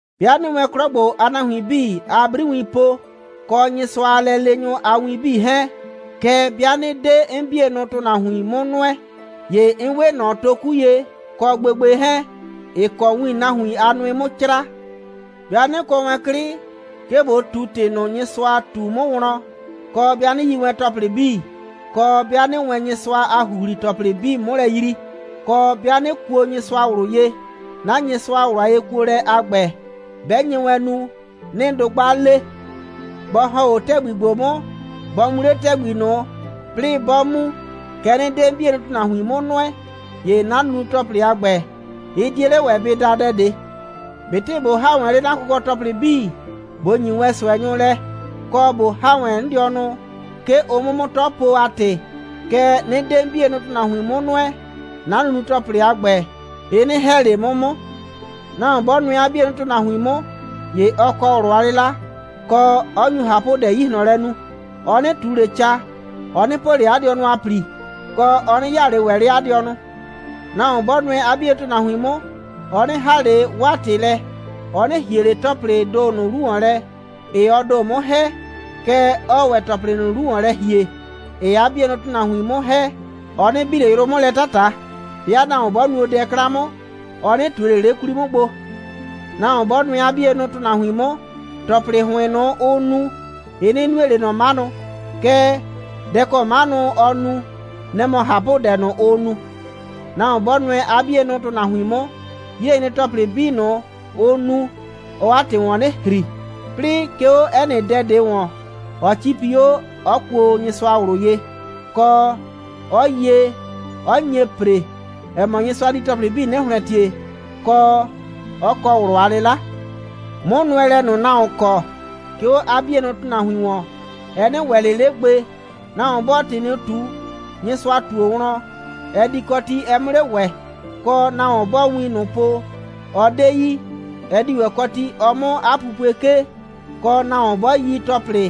'Bɩa 'nɩɩ wɛn 'klɔ ‑gbo a nahuin 'bii a 'briwiin po, kɔ Nyɩsʋa a lɛleenyʋ a wiin 'bii 'hɛɛn, kɛɛ, 'bɩa 'nɩ 'de 'n 'bienʋ ‑tʋnahuin 'mʋ nʋɛ, ‑ye 'n 'we ꞊nɔ toku ye, kɔ gbegbe 'hɛɛn, ‑ɩ kɔ win nahuin a nʋɩ 'mʋ 'craa. 'Bɩa 'nɩ kɔ wɛn 'klɩ, 'ke ꞊bo ꞊tu ‑tɩ ꞊nʋ, Nyɩsʋa ꞊tu 'mʋ wlɔn, kɔ, 'bɩa 'nɩ yi wɛn ‑tɔplɩ 'bii, kɔ, 'bɩa 'nɩɩ wɛn Nyɩsʋa a ‑huhli‑tɔplɩ 'bii 'mʋ lɛ yrii, kɔ, 'bɩa 'nɩ kuo Nyɩsʋa ꞊wlʋ ye, 'na Nyɩsʋa a ꞊wlʋ a yekuolɛ a ‑gbɛ, 'bɛ nye wɛn nu, 'nɩɩ dʋgba le, bɔ ‑hɔn 'o ‑tɛgbi ‑gbo 'mʋ, bɔ mu 'le ‑tɛgbi ꞊nʋ, 'plɩɩ 'bɔ mu, kɛɛ, 'nɩ 'de 'n 'bienʋ ‑tʋnahuin 'mʋ nʋɛ, ‑ye 'na nunu‑tɔplɩ a ‑gbɛ, ɩ 'die 'le ‑wɛ bɩ da dɛ ꞊de. ꞊Betɩ ꞊bo ‑ha wɛn 'le 'na kʋkɔ‑tɔplɩ 'bii, ꞊bo ‑nyi wɛn ꞊sʋɛnyʋ lɛ, kɔ ꞊bo ‑ha wɛn 'n dɩɔnʋ, 'ke ʋ 'mʋ 'mʋ 'tɔ po a ‑tɩ, kɛɛ, 'nɩ 'de 'n 'bienʋ ‑tʋnahuin 'mʋ nʋɛ, 'na nunu‑tɔplɩ a ‑gbɛ, ɩ 'nɩ ‑hɛ ꞊le 'mʋ 'mʋ. Nahuon 'bɔ nʋɛ 'a 'bienʋ ‑tʋnahuin 'mʋ, ‑ye ɔ kɔ ꞊wlʋ a 'lɩla, kɔ, 'ɔ nyu ꞊hapʋdɛ 'yi ꞊hlɔn lɛ nu. Ɔ 'nɩ ꞊tu ꞊le ca. Ɔ 'nɩ po ꞊le 'a dɩɔnʋ a ‑pli, kɔ, ɔ 'nɩ 'yaa ꞊le ‑wɛ 'le 'a dɩɔnʋ. Nahuon 'bɔ nʋɛ 'a 'bienʋ ‑tʋnahuin 'mʋ, ɔ 'nɩ ‑haa ꞊le 'waa ‑tɩ lɛ. Ɔ 'nɩ ‑hie ꞊le ‑tɔplɩɩ ‑do ꞊nʋ 'lu ‑wɔn lɛ, ‑ɩɩ ɔ ‑do 'mʋ ‑hɛ, kɛɛ, ɔɔ ‑wɛ ‑tɔplɩ ꞊nʋ 'lu ‑wɔn lɛ ‑hie, ‑ɩɩ 'a 'bienʋ ‑tʋnahuin 'mʋ ‑hɛ. Ɔ 'nɩ bi ꞊le yrʋ 'mʋ lɛ 'tata. 'Bɩa nahuon 'bɔ nuo dɛ 'klan 'mʋ, ɔ 'nɩ ꞊tue ꞊le 'le 'kwli 'mʋ gbo. Nahuon 'bɔ nʋɛ 'a 'bienʋ ‑tʋnahuin 'mʋ, ‑tɔplɩ ‑hʋɩn ꞊nʋ, ʋʋ nu, ɩ 'nɩ nue ꞊le ꞊nɔ 'manʋ, kɛɛ, dɛ ‑kɔ 'manʋ ɔɔ nu, nɛ‑ mɔ ꞊hapʋdɛ ꞊nʋ, ʋʋ nu. Nahuon 'bɔ nʋɛ 'a 'bienʋ ‑tʋnahuin 'mʋ, 'yilɛnyre‑tɔplɩ 'bii ꞊nʋ, ʋ nu, ɔɔ 'a ‑tɩ ‑wɔn 'nɩ ‑hri, 'plɩɩ 'ke 'o 'ɛ nɩ dɛ ꞊de ‑wɔn, ɔ 'cipi 'o ꞊o, 'ɔ kuo Nyɩsʋa ꞊wlʋ ye, kɔ, 'ɔ yie, 'ɔ nye ‑pre, ‑ɛ mɔ, Nyɩsʋa di ‑tɔplɩ 'bii 'nɩ ‑hlɛntie, kɔ, 'ɔ kɔ ꞊wlʋ a 'lɩla. 'Mʋnʋɛlɛ ꞊nʋ, nahuon kɔ, 'ke 'o 'a 'bienʋ ‑tʋnahuin ‑wɔn, ɛ 'nɩ ‑wɛ ꞊le 'le gbe. Nahuon bɔɔ ‑tɩ ꞊nʋ ꞊tu, Nyɩsʋa ꞊tuo wlɔn, ɛ di kɔ ti, ɛ 'mʋ 'le ‑wɛ, kɔ, nahuon bɔɔ win ꞊nʋ po, ɔ 'de yi, ɛ di ‑wɛ kɔ ti, ɔ 'mʋ 'a pupue 'kee, kɔ, nahuon bɔ yi ‑tɔplɩ,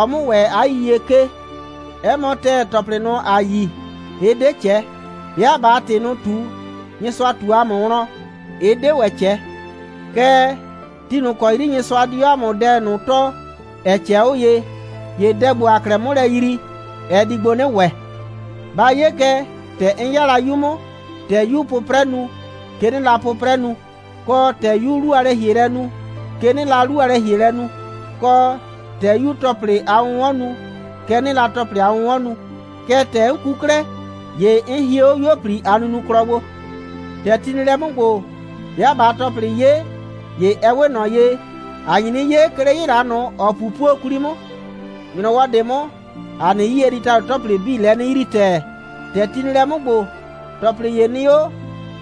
ɔ 'mʋ ‑wɛ 'a yiyie 'kee. 'Ɛ mɔ ‑tɛɛ, ‑tɔplɩ ꞊nʋ, ‑a yi, ɩ 'de ꞊cɛ. 'Bɩa ꞊baa ‑tɩ ꞊nʋ ꞊tu, Nyɩsʋa ꞊tu ‑a mʋ wlɔn, ɩ 'de ‑wɛ ꞊cɛ. Kɛɛ, ti ꞊nʋ ‑kɔ 'yri Nyɩsʋa di 'o ‑a mʋ dɛ ꞊nʋ tɔɔ, ‑ɛ ꞊cɛɛ 'o ye, ‑ye dɛ ‑gbo, ‑aa 'klɛɛ 'mʋ lɛ yrii, ɛ di gbo 'nɩ ‑wɛ. Ba 'ye kɛ, ‑tɛ 'n 'ya la 'yu 'mʋ, ‑tɛ 'yuu 'pʋprɛ nu, kɛ 'nɩɩ la 'pʋprɛ nu, kɔ, ‑tɛ 'yuu 'lu a lɛ‑hielɛ nu, kɛ 'nɩɩ la 'lu a lɛ‑hielɛ nu, kɔ, ‑tɛ 'yuu ‑tɔplɩ a 'wʋnwɔn nu, kɛ 'nɩɩ la 'a 'wʋnwɔn nu. Kɛɛ, ‑tɛ 'n ku 'klɛɛ, ‑ye 'n hie 'o 'yuo꞊pli a nunuklɔ gbo. ‑Tɛ ti nɩ lɛ 'mʋ ‑gbo, 'bɩa ꞊baa ‑tɔplɩ 'ye, ‑ye ɛ 'we ꞊nɔ ye, ‑a nyi 'nɩ 'ye, 'ke 'le 'yɩla ꞊nʋ, ‑ɔ 'pupuo 'kwli 'mʋ. ‑Nyrɔwɔ ꞊de 'mʋ, ‑a nɩ 'yie di ‑tado ‑tɔplɩ 'bii lɛ 'nɩ yrii ‑tɛɛ. ‑Tɛ ti nɩ lɛ 'mʋ ‑gbo, ‑tɔplɩ ‑ye nɩ 'o,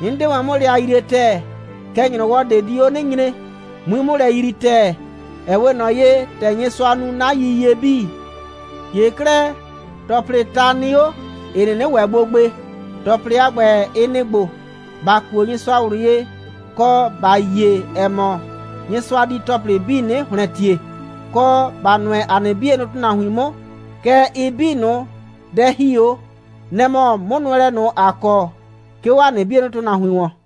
'n 'de wɛn 'mʋ lɛ a yrie ‑tɛɛ. Kɛɛ, ‑nyrɔwɔ ꞊de di 'o 'nɩ nyre, 'mui 'mʋ lɛ yrii ‑tɛɛ, ‑ɛ 'we ꞊nɔ ye, ‑tɛ Nyɩsʋa nu 'na yiyie 'bii. ‑Ye 'klɛɛ, ‑tɔplɩɩ ta nɩ 'o, ‑ɩ 'nɩnɩ ‑wɛ gbo gbe. ‑Tɔplɩ a ‑gbɛ, ɩ nɩ‑ ‑gbo: ‑Ba kuo Nyɩsʋa ꞊wlʋ ye, kɔ, ‑ba yie, ‑ɛ mɔ, Nyɩsʋa di ‑tɔplɩ 'bii 'nɩ ‑hlɛntie, kɔ, ‑ba nʋɛ ‑a nɩ 'bienʋ ‑tʋnahuin 'mʋ. Kɛɛ, ɩ 'bii ꞊nʋ, dɛ ‑hi 'o, nɛ‑ mɔ 'mʋnʋɛlɛ ꞊nʋ, ‑a kɔ, 'ke 'o ‑a nɩ 'bienʋ ‑tʋnahuin ‑wɔn.